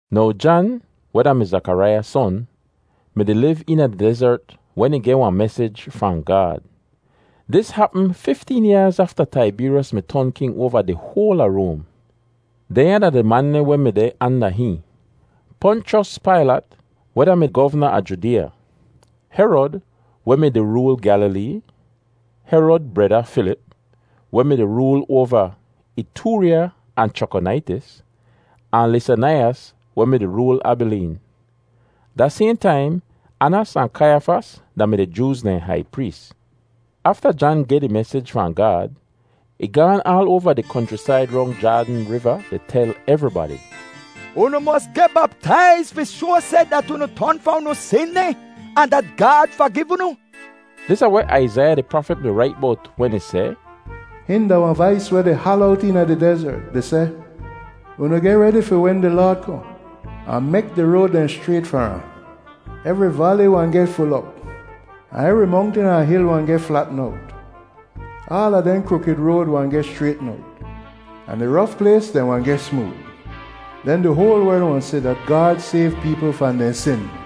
Now Jan, weh da-mi Zakaraiya son, mi-di liv eena di dezert wen ih geh wahn mesij fahn Gaad. Dis hapm fifteen yaaz afta Taibeeryos mi ton king oava di hoal a Roam. Dehnya da di man dehn weh mi deh anda hihn: Ponchos Pailat, weh da-mi govna a Judeeya; Herod, weh mi-di rool Gyalilee; Herod breda Filip, weh mi-di rool oava Itoorya ahn Chrakonaitis; ahn Lisanaiyas, weh mi-di rool Abileen. Da sayhn taim Anas ahn Kaiyafas da-mi di Jooz dehn hai prees. Afta Jan geh di mesij fahn Gaad, ih gaan aal oava di konchrisaid rong Jaadn Riva di tel evribadi, “Unu mos geh baptaiz fi shoa seh dat unu ton fahn unu sin dehn ahn dat Gaad fagiv unu.” Dis da weh Aizaiya di prafit mi rait bowt wen ih seh, “Hihn da wahn vais weh di hala owt eena di dezert di seh, ‘Unu geh redi fi wen di Laad kohn, ahn mek di road dehn schrayt far ahn. Evri vali wahn geh ful op, ahn evri mongtin ahn hil wahn geh flatn owt. Aala dehn krukid road wahn geh schraytn owt, ahn di rof plays dehn wahn geh smood. Den di hoal werl wahn si dat Gaad sayv peepl fahn dehn sin.’”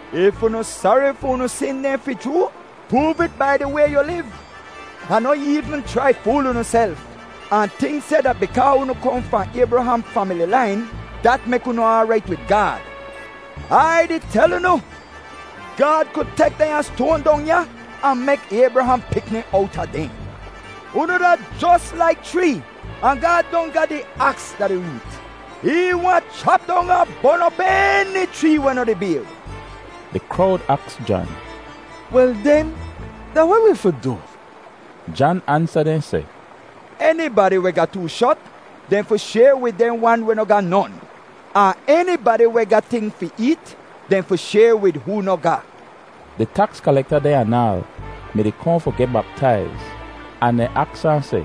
If unu sari fi unu sin dehn fi chroo, proov it bai di way yu liv. Ahn noh eevn chrai fool unuself ahn tink seh dat bikaa unu kohn fahn Aybraham famili lain, dat mek unu aarait wid Gaad. Ai di tel unu, Gaad ku tek dehnya stoan dong ya ahn mek Aybraham pikni owta dehn. Unu da jos laik chree, ahn Gaad don ga di aks da di root. Ih wahn chap dong ahn bon op eni chree weh noh di bayr.” Di krowd aks Jan, “Wel den, da weh wi fi du?” Jan ansa dehn seh, “Enibadi weh ga too shot, dehn fi shayr wid dehn wan weh noh ga non. Ahn enibadi weh ga ting fi eet, dehn fi shayr wid hoo noh ga.” Di taks kalekta dehn anaal mi-di kohn fi geh baptaiz, ahn dehn aks ahn seh,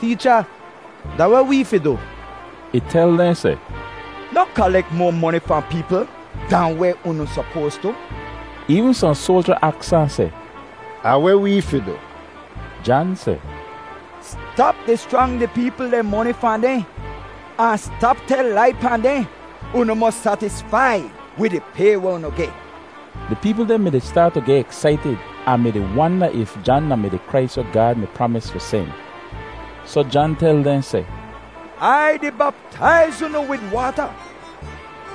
“Teecha, da weh wee fi du?” Ih tel dehn seh, “Noh kalek moa moni fahn peepl dahn weh unu sopoas tu.” Eevn sohn soalja aks ahn seh, “Ahn weh wee fi du?” Jan seh, “Stap di schrang di peepl dehn moni fahn dehn, ahn stap tel lai pahn dehn. Unu mos satisfai wid di pay weh unu geh.” Di peepl dehn mi-di staat tu geh eksaitid ahn mi-di wanda if Jan da-mi di Krais weh Gaad mi pramis fi sen. Soh Jan tel dehn seh, “Ai di baptaiz unu wid waata,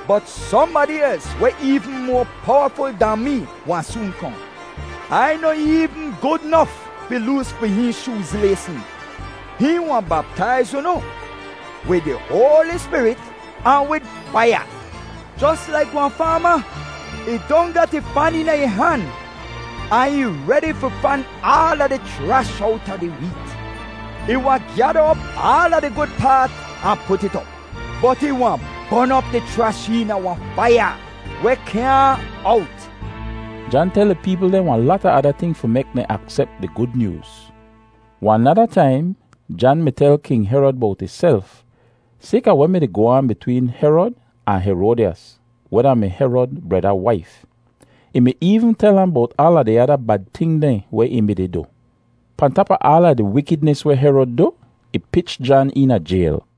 bot sohnbadi els weh eevn moa powaful dahn mee wahn soon kohn. Ai noh eevn gud nof fi loos fi hihn shooz laysn. Hihn wahn baptaiz unu wid di Hoali Spirit ahn wid faiya. Jos laik wahn faama, ih don gat ih fan eena ih han, ahn ih redi fi fan aala di chrash owta di weet. Ih wahn gyada op aala di gud paat ahn put it op, bot ih wahn bon op di chrash eena wahn faiya weh kyaahn owt.” Jan tel di peepl dehn wahn lata ada ting fi mek dehn aksep di Gud Nyooz. Wahn nada taim, Jan mi tel King Herod bowt ihself sayka weh mi-di goh aan bitween Herod ahn Heroadyas, weh da-mi Herod breda waif. Ih mi eevn tel ahn bowt aala di ada bad ting dehn weh ih mi-di du. Pahn tap a aala di wikidnis weh Herod du, ih pich Jan eena jayl.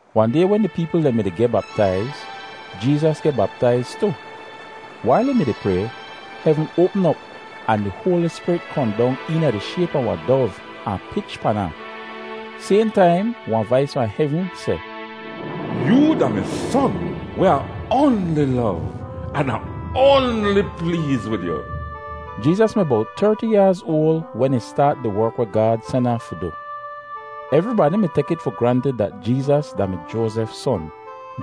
Wahn day wen di peepl dehn mi-di geh baptaiz, Jeezas geh baptaiz tu. Wail ih mi-di pray, hevn oapm op, ahn di Hoali Spirit kohn dong eena di shayp a wahn dov ahn pich pan ahn. Sayhn taim wahn vais fahn hevn seh, “Yoo da mi Son weh Ah oanli lov, an Ah oanli pleez wid yu.” Jeezas mi bowt terti yaaz oal wen ih staat di werk weh Gaad sen ahn fi du. Evribadi mi tek it fi grantid dat Jeezas da-mi Joazef son.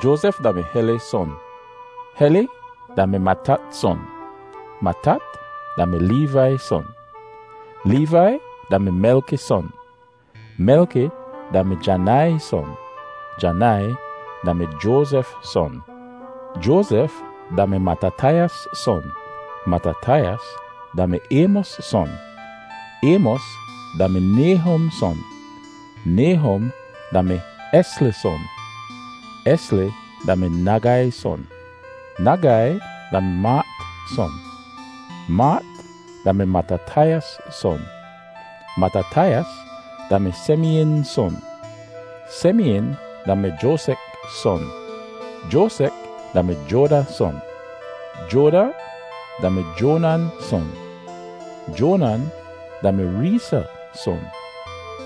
Joazef da-mi Heli son. Heli da-mi Matat son. Matat da-mi Leevai son. Leevai da-mi Melki son. Melki da-mi Janai son. Janai da-mi Joazef son. Joazef da-mi Matatayas son. Matatayas da-mi Aymos son. Aymos da-mi Nayhum son. Nayhum da-mi Esli son. Esli da-mi Nagai son. Nagai da-mi Maat son. Maat da-mi Matatayas son. Matatayas da-mi Semeyin son. Semeyin da-mi Joasek son. Joasek da-mi Joada son. Joada da-mi Joanan son. Joanan da-mi Reesa son.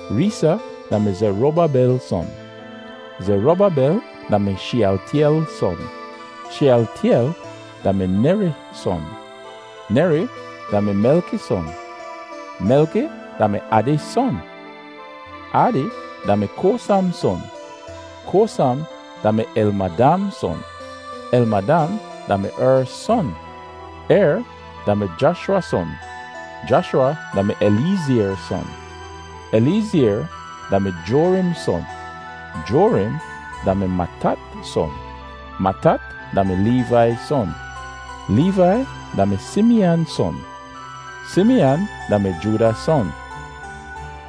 Reesa da-mi Zerubabel son. Zerubabel da-mi Sheyaltyel son. Sheyaltyel da-mi Neri son. Neri da-mi Melki son. Melki da-mi Adi son. Adi da-mi Kosam son. Kosam da-mi Elmadam son. Elmadam da-mi Er son. Er da-mi Jashwa son. Jashwa da-mi Eliyezr son. Eliyezr da-mi Jorim son. Jorim da-mi Matat son. Matat da-mi Leevai son. Leevai da-mi Simiyan son. Simiyan da-mi Jooda son.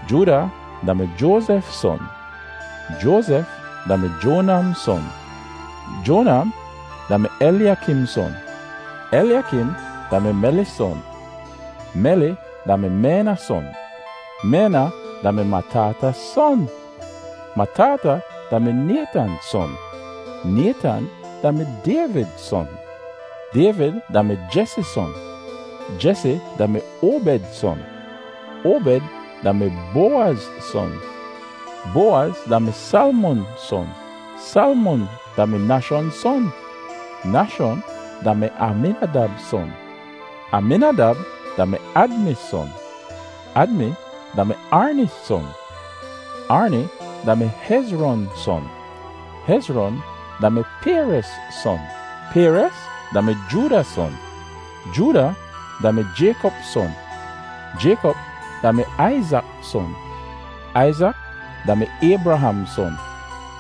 Jooda da-mi Joazef son. Joazef da-mi Jonam son. Jonam da-mi Elyakim son. Elyakim da-mi Meli son. Meli da-mi Mena son. Mena da-mi Matata son. Matata da-mi Naytan son. Naytan da-mi Dayvid son. Dayvid da-mi Jesi son. Jesi da-mi Obed son. Obed da-mi Bowaz son. Bowaz da-mi Salmon son. Salmon da-mi Nashon son. Nashon da-mi Aminadab son. Aminadab da-mi Admi son. Admi da-mi Arni son. Arni da-mi Hezron son. Hezron da-mi Perez son. Perez da-mi Jooda son. Jooda da-mi Jaykop son. Jaykop da-mi Aizak son. Aizak da-mi Aybraham son.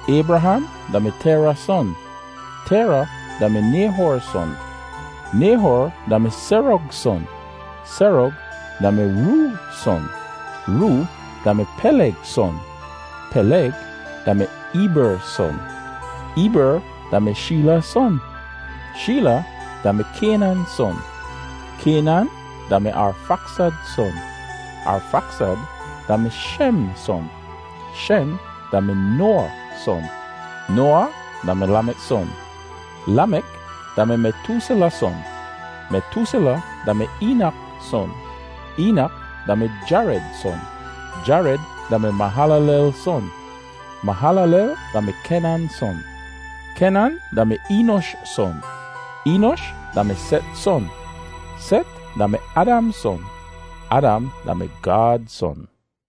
Aybraham da-mi Tera son. Tera da-mi Nayhor son. Nayhor da-mi Serog son. Serog da-mi Roo son. Roo da-mi Peleg son. Peleg da-mi Eeber son. Eeber da-mi Sheela son. Sheela da-mi Kaynan son. Kaynan da-mi Arfaksad son. Arfaksad da-mi Shem son. Shem da-mi Noawa son. Noawa da-mi Lamek son. Lamek da-mi Metoosela son. Metoosela da-mi Eenak son. Eenak da-mi Jared son. Jared da-mi Mahalalel son. Mahalalel da-mi Kenan son. Kenan da-mi Eenosh son. Eenosh da-mi Set son. Set da-mi Adam son. Adam da-mi Gaad son.